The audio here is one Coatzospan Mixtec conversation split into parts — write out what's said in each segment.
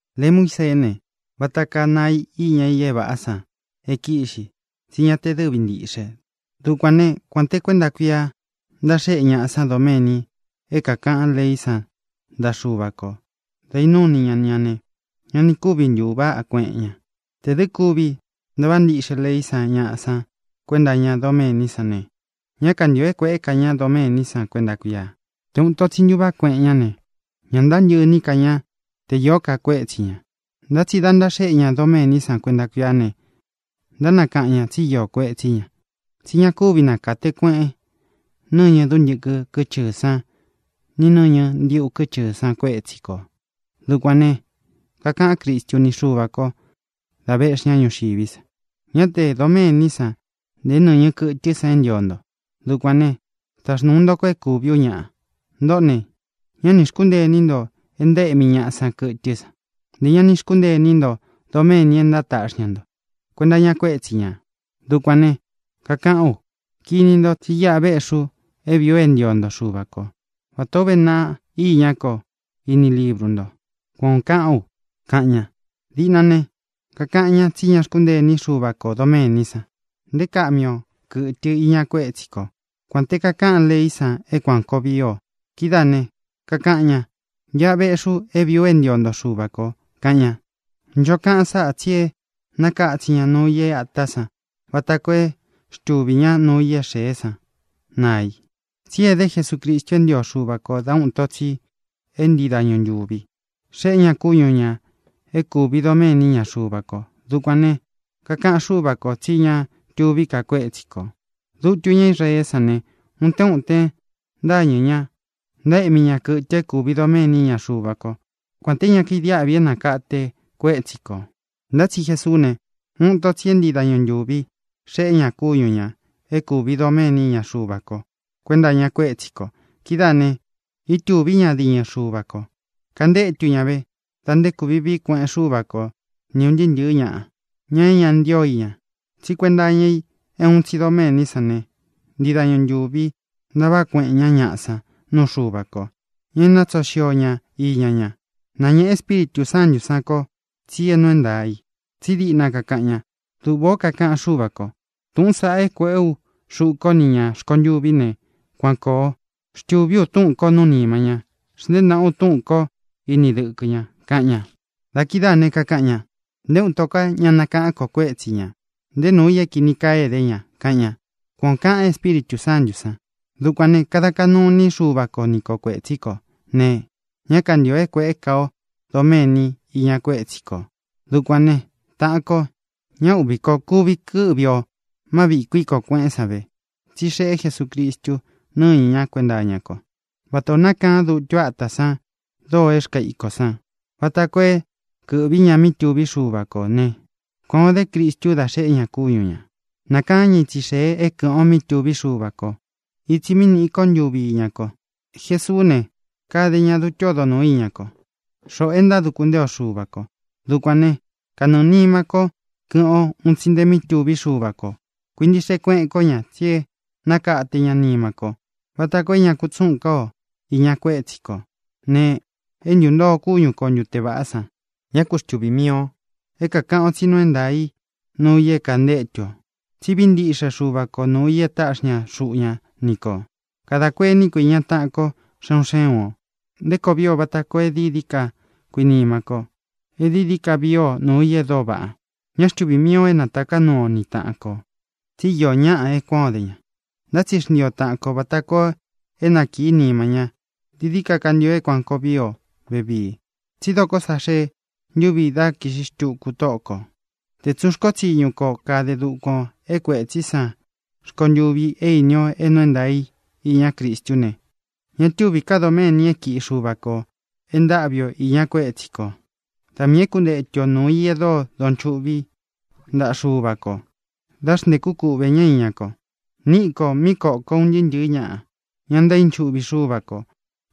Lei Muíseé ne, vata kaa naꞌa i iña i é vāꞌá san é kīꞌxi, tsí ña te dɨvi ntiꞌxe. Dukuān né, kuān te kuénta kuia ntaxéꞌe ñaꞌa san doméni é kākaꞌan leí san ntaꞌa Xuva kō dá īnúu ini ña ña ne, ña ni kúvi ntūváꞌa kueꞌen ña. Tē dɨ́ kuvi ntaváꞌa ntiꞌxe leí san ñaꞌa san kuenta iña doméní san ne, ñá kantīo é kuēꞌé ka ña doméní san kuenta kuia. Te ūun ito tsi ntuváꞌa kueꞌen ñá ne, ña ntántɨꞌɨ iní ka ña te īó ka kuétsi ñā. Ntá tsi dā ntaxéꞌe ña doméní san kuenta kuia ne, ntánakaꞌan ñā tsi íō kuetsí ña, tsi ña kúvi nakate kueꞌen nɨñɨ dúntɨkɨ kɨ́chɨɨ̄ sán ni nɨ̄ñɨ ndíꞌu kɨ́chɨɨ̄ san kuétsi kō. Dukuān ne, kakaꞌan Crístu ni Xuva kō da véꞌxi ña ñuxiví sa: Ñá tē doméní san, nté nɨ̄ñɨ kɨtɨ́ san é ntio nto. Dukuān né, taxnūu nto ko é kúvī ú ñaꞌa. Ntōꞌó ne, ñá nī xkúntee iní nto é ntaéꞌmi ñaꞌa san kɨtɨ́ san; ntē ña ni xkúntee iní nto doméni é ntátaꞌxi ña nto kuenta iña kuétsi ñā. Dukuān ne, kakaꞌán u: “Kini nto, tsí iꞌa véꞌxī u é vīí u é ntio nto, Xuvā kó, vatā ó uve naꞌa iñá ko iní libru nto”, kuan ō kaꞌán u, kaꞌan ña. Diꞌna ne, kakaꞌan ñá tsi ña xkúntee iní Xuva kō doméní san, nte é kaꞌmi o kɨ̄tɨ iña kuétsi ko, kuān te kakáꞌan leí san é kuān koo vii o. Kidáā ne, kakaꞌan ña: “Iꞌa véꞌxī u é vīí u é ntio nto, Xuvā ko”, kaꞌan ña. Ncho kaꞌan sáꞌa tsi e nákatsin ña nuu i é ātá san vata koo é xtuvī ñá nuu i é xēé san naa i. Tsí edé Jesucristu é ntio Xuva kō dá uun ito tsi é ntii dañu ntūvi xeꞌé ña kúñu ñā é kūvi doméni iña Xuva ko. Dukuān ne, kakaꞌan Xúva kō tsí ña tuví ka kuétsi kō. Dutu ñá Israeé san ne, utén utén ntáñɨ̄ ña, ntaéꞌmi ña kɨtɨ é kūvi doméni iña Xuva kó, kuān té ña kaidiáꞌvi é nākate kuétsi kō. Ntá tsi Jesuú ne, uun ito tsi é ntii dañu ntūvi xeꞌé ña kúñu ñā é kūvi doméni iña Xuva ko kuenta iña kuétsi kō. Kidáā ne, ítūví ña diñɨ Xuva kō. Kantétu ña vē da nté kūvi vií kueꞌen Xúva ko ni ūn ntɨɨ́ ntɨ̄ɨ́ ñaꞌa, ña é ña ntío i ña. Tsí kuenta iña i é uun tsi doméní san ne, ntii dañu ntūvi ntaváꞌa kueꞌen ñá ñaꞌa san nuu Xuva ko, ña e nátsoo xio ña iña ña. Náñēꞌe Espíritū Sántū sán kō tsi é nuu é ntaā i, tsí diꞌna kakaꞌan ña: Duꞌvā ó kakaꞌan Xúva kō: “Tūꞌún saꞌa é kuēꞌé u xuꞌu kó ni ñā rkontuví ne, kuan kōo. Xtūví u túꞌūn ko nuú nima ña. Xntēé naꞌa u túꞌūn ko ini dɨkɨ ña”, kaꞌan ña. Da kidáā ne, kakaꞌan ña: “Nté uun ito ká ña nakáꞌān ko kuétsi ñā, nté nuu i é kīni kaa é edé ña”, kaꞌan ña. Kuan ō kaꞌan Espíritū Sántū san. Dukuān ne, dá kadā kaꞌnu iní Xuva ko ni ko kuētsí kō ne, ñá kantīo é kuēꞌé ka o doméni iña kuétsi kō. Dukuān né, taꞌan ko, ñá uꞌvī ko. Kuvi kɨ́ꞌvi ō má viꞌī kuíkō kueꞌén san ve, tsí xeꞌé Jesucristu nɨ́ñɨ ñá kuenta iña ko. Vatā o nákaan dutu átā san doo é rkaa ikō san, vata koo é kɨ̄ꞌví ña mí tuvi Xuva kó ne, kuān o dé Cristu dá xeꞌé ña kúñu ñā. Nākaán ña itsi xēe é kɨ̄ꞌɨn o mí tuvi Xuva ko, itsi mí nīꞌi ko ntuvi íña ko. Jesuú ne, kade ña dutu ódo nūu iña ko, xoꞌo é ntáduku ntee o Xuva kō. Dukuān né, kanɨɨ̄ nima ko kɨ́ꞌɨn o un tsi nte mi túvi Xuva kō. Kuintiꞌxe kueꞌen kó ña, tsi e nákate ña nima ko vata koo é ña kutsúꞌūn ká o īña kuétsi kō ne, é ntūntoo kúñu ko ntute vāꞌá san. Ñá ku xtuvī mii o é kākaꞌan o tsí nuu é ntaā í nuu i é kantétu ō, tsí vií ntiꞌxe Xuva ko nūu i e táꞌxi ña xuꞌu ña ni kō. Kadā kuení ko īña taꞌan ko, xé un xé un ō, nté koo vii o vata koo é dií dií ka kuinima ko, é dií dií ka vii o nuu i e dóo vaꞌa. Ñá xtuvī mii o é nātaká nuu o ni taꞌan kō, tsi íō ñáꞌa e kuán o de ña. Ntá tsi xntii o tāꞌan ko vata koo é nakīí nima ña. Dií dií ka kantio é kuān koo vii o vevíi, tsí dokó sa xee ntúvi dá kīꞌxi xtuku Tóꞌo kō. Tē tsun rkó tsiñu ko kade dukuan ō é kuētsí san rkontûvi é īni o é nuu é ntaā i iña Cristú ne, ña túvī ká doméni é kiꞌi Xuva kō e ntáꞌvi o īña kuétsi kō. Da miī é kuntetu o nūu i e dóo donchuꞌví ntaꞌa Xuva kō dá xntēkú kuꞌvē ñá iña ko. Níꞌi kō míꞌi koko un ntɨɨ́ ntɨ̄ɨ́ ñaꞌa, ña ntaínchuꞌvi Xúva kō.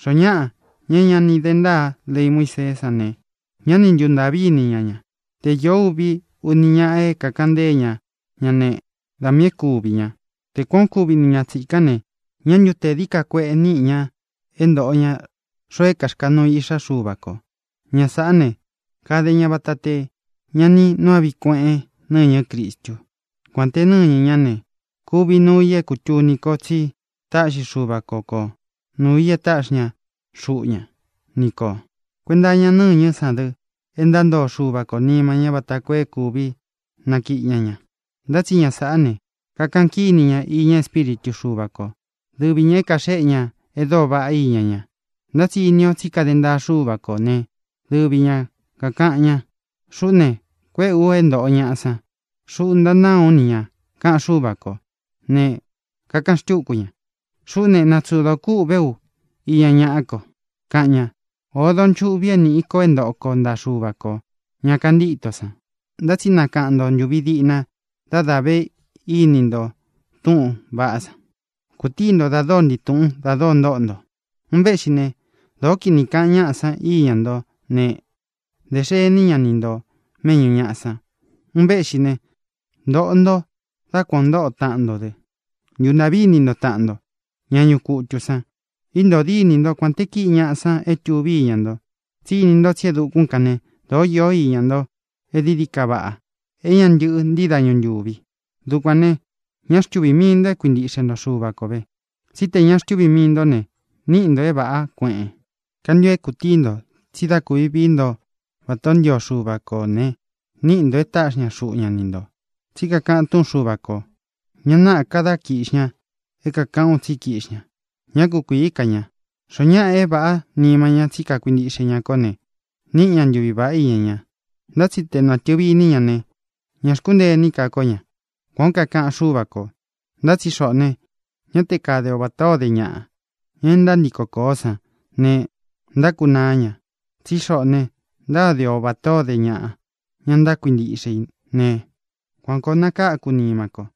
Xoo ñáꞌa, ña é ña ni de ntáa lei Muíseé san ne, ñá ni ntuntāꞌví ini ña ña. Te īó uvi, uni ñaꞌa é kākaꞌan ntée ña ña ne, da miī é kuvī ña. Te kuān o kúvi ni ña tsīkán ne, ¿ñā ntu te dií ka kueꞌe niꞌi ña é ntōꞌo ña xoo é kāxkanuu i Iꞌxá Xuva kō? Ña sāꞌá ne, kade ña vata te ña ni nuu áꞌvi kueꞌen nɨñɨ́ Cristu, kuān te nɨ́ñɨ ñá ne, kūvi nuu i é kūtuni ko tsi táꞌxi Xuva ko ko nūu i e táꞌxi ña xuꞌu ña ni kō. Kuenta iña nɨ́ñɨ́ san dɨ e ntántoo Xuva kō nima ña vata koo é kūvi nakiꞌi ña ña. Ntá tsi ña sāꞌá ne, kakaꞌan kíni ña iña Espíritu Xuva ko, dɨvi ñā é kaxéꞌe ña e dóo vaꞌá iña ña. Ntá tsi ini ō tsí kade ntaa Xúva kō né, dɨvi ña kākaꞌan ña: “Xuꞌú ne, kuéꞌē u é ntōꞌo ñaꞌa san. Xuꞌú ntanáa ú ni ñā”, kaꞌan Xúva kō. Ne, kakaꞌan xtúku ña: “Xuꞌú ne, natsodo kūꞌvé u iña ñaꞌá ko”, kaꞌan ña. ¡Ōo donchuꞌvi é nīꞌi ko é ntoꞌo ko ntaꞌa Xuva kō, ña kantíto san! Ntá tsi nakaꞌan nto ntūvi diꞌna dá dā ve íni nto túꞌūn vaꞌá san. Kūtií nto da dóo ntii tūꞌun da dóo ntóꞌo nto. Un véꞌxi ne, dōó kinī kaꞌan ñáꞌa san íña ntó ne, dē xení ña ni nto mēꞌñú ñaꞌa san. Un véꞌxi ne, ntōꞌo nto dá kuan ō ntóꞌo taꞌan nto dɨ. Ntūntaꞌví ini nto taꞌan nto, ña ñuꞌu kutū san. Íntōo dínī ntó kuān te kíꞌi ñaꞌa san é tuví iña nto, tsí ini nto tsí e dukún kan ne, dōó iō iña nto e dií dií ka vaꞌa, é ña ntɨꞌɨ ntii dañu ntúvi. Dukuān ne, ñá xtuvī mii nto é kuintiꞌxe nto Xuva ko vē, tsí tē ña xtuví mii ntó ne, níꞌi ntō é vāꞌá kueꞌen. Kantio é kūtíi nto tsi dá kūvi vií nto vatā ó ntio Xuva kō ne, níꞌi ntō e táꞌxi ña xuꞌu ña ni ntō. Tsí kakaꞌan túꞌun Xuva kō: Ña náꞌā ka dá kiꞌxi ña é kākaꞌán u tsí kīꞌxí ña. Ñá kukuīí ka ña. Xoó ñaꞌa é vāꞌá nima ñá tsi kakuintiꞌxe ña kó ne, níꞌi ña ntuvi vāꞌá iña ña. Ntá tsi te nātɨvi iní ña ne, ña xkúntee iní ka kó ña. Kuan ō kaꞌan Xúva kō. Ntá tsi xoꞌō ne, ña te kade o vatā ó de ñaꞌa, ña e ntántiko kōó san ne, ntákunaá ña. Tsí xoꞌō ne, ntáde o vatā ó de ñaꞌa, ña ntákuintiꞌxe i ne, kuan kōo nakáku nima ko.